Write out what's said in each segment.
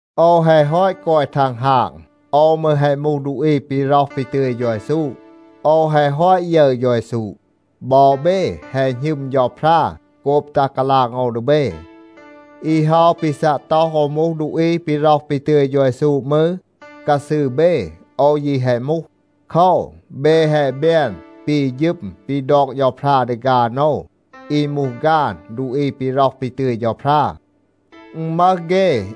โอว แฮะ ฮอต กอย ทังฮาง. โอว มืร แฮะ มูห ดูอี ปี ร็อห ปี ตึย เฌา เยซู. โอว แฮะ ฮอต ยึร เฌา เยซู. บอ เบ แฮะ หณึม เฌาพรา โกบ ตัห กาลาง โอว ดี เบ. อี เฮา ปี ซัะ ต็อห โอว มูห ดูอี ปี ร็อห ปี ตึย เฌา เยซู มืร, กาซืร เบ โอว ยี แฮะ มูห. โคว, เบ แฮะ แบน ปี ฌึม ปี ดอก เฌาพรา ดี ฆาน โอว อี มูห ฆาน ดูอี ปี ร็อห ปี ตึย เฌาพรา. อึณ มึห เฆ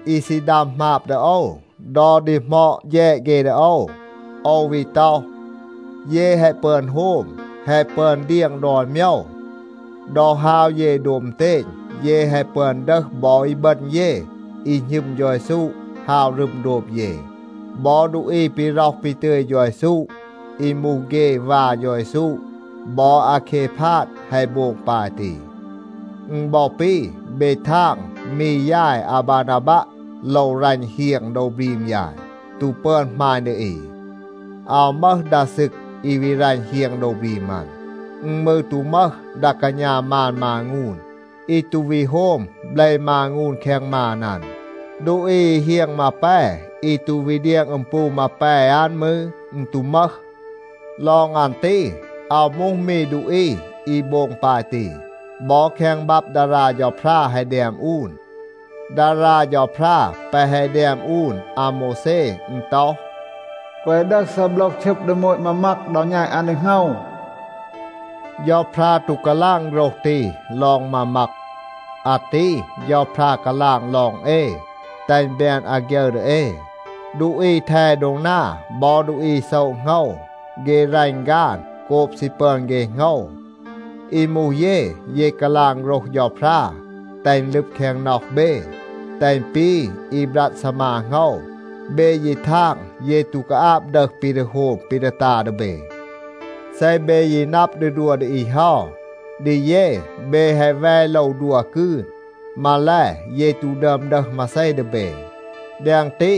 อี ซี ดัม หมาบ ดี โอว. ดอ ดีหมอด แฌด เฆ ดี โอว, โอว วี ต็อห, เย แฮะ ปึอน โฮม, แฮะ ปึอน เดียง ดอน โมยว. ดอ ฮาว เย โดบ อึณเตณ, เย แฮะ ปึอน ดึห บอ อีบึณ เย อี หณึม เฌา เยซู, ฮาว รึม โดบ เย. บอ ดูอี ปี ร็อห ปี ตึย เฌา เยซู, อี มูห เฆ วา เฌา เยซู บอ อาเคพาดa แฮะ โบง ปาย ตี. อึณ บอ ปี เบ ทาง มี ยาย อาบานาบัะ โลว รัณ เฮียง โดว บรีม ยาย, ตู ปึอน หมาณ ดี อี. อาว มึห ดา ซึก อี วี รัณ เฮียง โดว บรีม อัน. อึณ มืร ตู มึห ดา กาณา มาน มางูน อี ตู วี โฮม เบล มางูน แคง มาน อัน. ดูอี อี เฮียง มาแป อี ตู วี เดียง อึม ปู มาแป อัน มืร, อึณ ตู มึห. ลอง อัน ตี, อาว มูห มี ดูอี อี โบง ปาย ตี. บอ แคง บับ ดารา เฌาพรา แฮะ แดม อูน. ดารา เฌาพรา แปะ แฮะ แดม อูน อาโมวแซ, อึณ ต็อห, “แกวะ ดึห ซีโบลห ชึบ ดี โมต มามัก ดอ แณต อัน ดี โหงว.” เฌาพรา ตู กาลาง โฆรห ตี ลอง มามัก. อาตี เฌาพรา กาลาง ลอง เอ, แตห อึณ แบน อาฆยึร ดี เอ. ดูอี แท โดง นา บอ ดูอี โซะ โหงว, เฆ รัณ ฆาน โกบ ซี ปึอน เฆ โหงว. อี มูห เย, เย กาลาง โฆรห เฌาพรา แตห อึณ ลึบ แคง น็อห เบ, แตห อึณ ปี อี บรัด ซีมา โหงว. เบ ยี ทาง, เย ตู กาอาบ ดึห ปี ดี โฮม ปี ดี ตา ดี เบ. เซ เบ ยี นับ ดี ดัว ดี อี เฮา, ดี เย เบ แฮะ แว โลว ดัว กืน. มาแล, เย ตู ดึอม ดึห มาเซ ดี เบ. แดง ตี,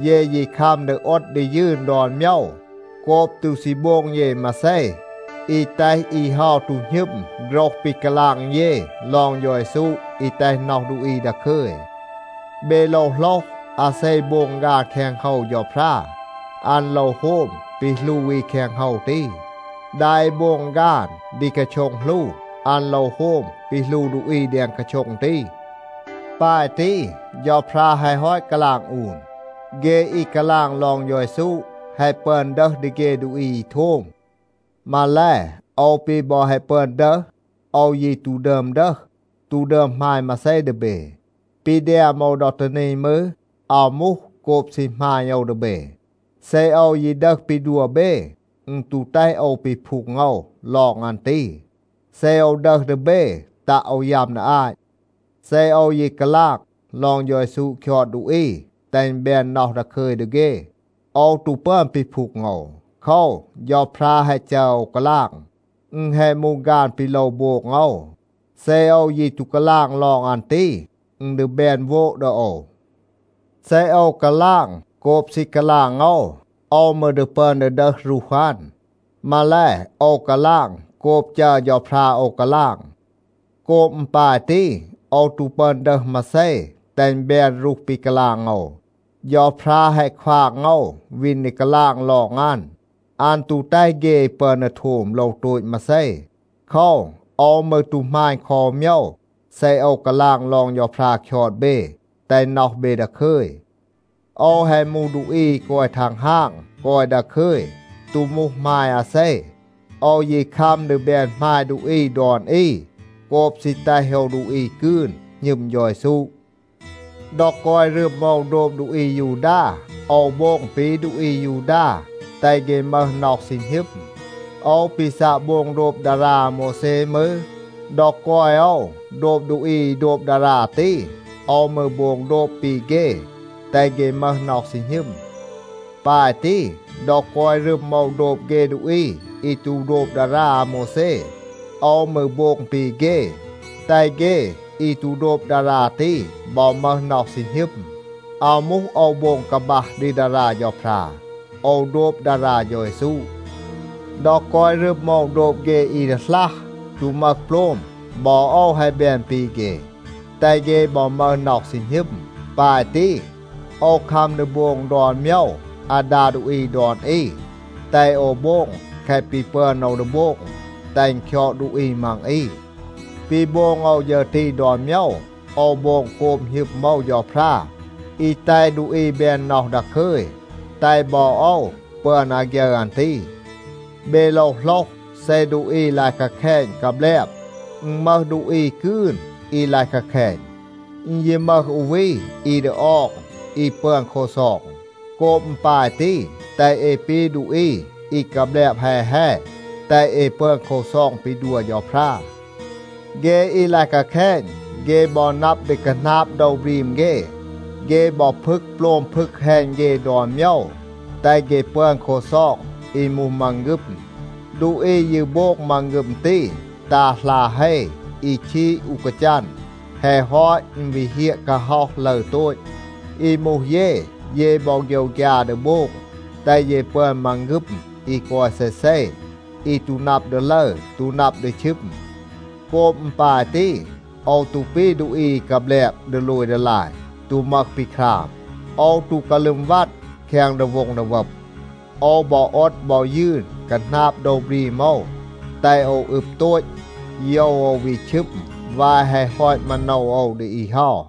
เย ยี คัม ดี โอด ดี ยืน ดอน โมยว, โกบ ตู ซี โบง เย มาเซ อี แตห อี เฮา ตู หณึม โฆรห ปี กาลาง เย ลอง เฌา เยซู อี แตห น็อห ดูอี ดาคึย. เบ โลว โหลห, อาเซ โบง ฆาน แคง โฮว เฌาพรา, อัน โลว โฮม ปี หลู อี แคง โฮว ตี. ดา อี โบง ฆาน ดี กาโช็ง หลู, อัน โลว โฮม ปี หลู ดูอี แดง กาโช็ง ตี. ปาย ตี, เฌาพรา แฮะ ฮอต กาลาง อูน. เฆ อี กาลาง ลอง เฌา เยซู แฮะ ปึอน ดึห ดี เฆ ดูอี อี โทม. มาแล, โอว ปี บอ แฮะ ปึอน ดึห, โอว ยี ตู ดึอม ดึห, ตู ดึอม หมาณ มาเซ ดี เบ. ปี แดม โอว ดอ ตี นี มืร, อาว มูห โกบ ซี หมาณ โอว ดี เบ. เซ โอว ยี ดึห ปี ดัว เบ, อึณ ตู แตห โอว ปีพูง โอว ลอง อัน ตี. เซ โอว ดึห ดี เบ, ตัะ โอว ยัม ดี อาต. เซ โอว ยี กาลาง ลอง เฌา เยซู คยอด ดูอี แตห อึณ แบน น็อห ดาคึย ดี เฆ, โอว ตู ปึอน ปีพูง โอว. โคว, เฌาพรา แฮะ จัร โอว กาลาง. อึณ แฮะ มูห ฆาน ปี โลว โบง โอว. เซ โอว ยี ตู กาลาง ลอง อัน ตี, อึณ ดี แบน โวด ดี โอว. เซ โอว กาลาง โกบ ซี กาลาง โอว, โอว มืร ดี ปึอน ดี ดึห รูห อัน. มาแล, โอว กาลาง โกบ จัร เฌาพรา โอว กาลาง. โกบ อึณ ปาย ตี, โอว ตู ปึอน ดึห มาเซ, แตห อึณ แบน รูห ปี กาลาง โอว, เฌาพรา แฮะ ควาง โอว วีน ดี กาลาง ลอง อัน. อัน ตู แตห เฆ อี ปึอน ดี โทม โลว โตต มาเซ. โคว, โอว มืร ตู หมาณ คอ อู โมยว เซ โอว กาลาง ลอง เฌาพรา คยอด เบ, แตห น็อห เบ ดาคึย. โอว แฮะ มูห ดูอี อี กอย ทังฮาง, กอย ดาคึย, ตู มูห หมาย อาเซ. โอว ยี คัม ดี แบน หมาย ดูอี ดอน อี โกบ ซี แตห โอว ดูอี กืน หณึม เฌา เยซู. ดอ กอย รึม โอว โดบ ดูอี อายูดา, โอว โบง ปี ดูอี อายูดา, แตห เฆ มึห น็อห ซี หณึม. โอว ปี ซัะ โบง โดบ ดารา อาโมวแซ มืร, ดอ กอย โอว โดบ ดูอี อี โดบ ดารา ตี, โอว มืร โบง โดบ ปี เฆ, แตห เฆ มึห น็อห ซี หณึม. ปาย ตี, ดอ กอย รึม โอว โดบ เฆ ดูอี อี ตู โดบ ดารา อาโมวแซ, โอว มืร โบง ปี เฆ, แตห เฆ อี ตู โดบ ดารา ตี บอ มึห น็อห ซี หณึม. (อาว มูห โอว โบง กาบัห ดี ดารา เฌาพรา. โอว โดบ ดารา เฌา เยซู.) ดอ กอย รึม โอว โดบ เฆ อี ดีหลัห, ตู มึห โปลม, บอ โอว แฮะ แบน ปี เฆ, แตห เฆ บอ มึห น็อห ซี หณึม. ปาย ตี, โอว คัม ดี โบง ดอน โมยว อาดา ดูอี ดอน อี, แตห โอว โบง แคะ ปี ปึอน โอว ดี โบง แตห อึณ คยอด ดูอี มัง อี. ปี โบง โอว ฌึร ตี ดอน โมยว, โอว โบง โกบ หณึม โอว เฌาพรา อี แตห ดูอี แบน น็อห ดาคึย, แตห บอ โอว ปึอน อาฆยึร อัน ตี. เบ โลว โหลห, เซ ดูอี ลาย กาแคณ กาแบลบ, อึณ มึห ดูอี กืน อี ลาย กาแคณ. อึณ ยี มึห อู วี อี ดี ออง, อี ปึอน ลักซอง. โกบ อึณ ปาย ตี, แตห เอ ปี ดูอี อี กาแบลบ แฮ แฮ, แตห เอ ปึอน ลักซอง ปี ดัว เฌาพรา. เฆ อี ดี ลาย กาแคณ, เฆ บอ นับ ดี คาหนาบ โดว บรีม เฆ. เฆ บอ พึก โปลม พึก แฮณ เฆ ดอน โมยว, แตห เฆ ปึอน ลักซอง อี มูห มังฆึม. ดูอี ยี โบง มังฆึม ตี, ตา หลา เฮ อี ชีด อู กาจัน. แฮะ ฮอต, อึณ วี เฮียะ กาฮ็อห ลึร โตต. อี มูห เย, เย บอ โฆยวฆยา ดี โบง, แตห เย ปึอน มังฆึม อี กอย เซเซ, อี ตู นับ ดี ลึร, ตู นับ ดี ชึม. โกบ อึณ ปาย ตี, โอว ตู ปี ดูอี อี กาแบลบ ดีโลย ดีลาย, ตู มึห ปี คราม. โอว ตู กาลึม วัด แคง ดีโว็ง ดีวับ. โอว บอ โอด บอ ยืน คาหนาบ โดว บรีม โอว แตห โอว อึบ โตต, โยว โอว วี ชึม วาย แฮะ ฮอต มาโนว โอว ดี อี เฮา.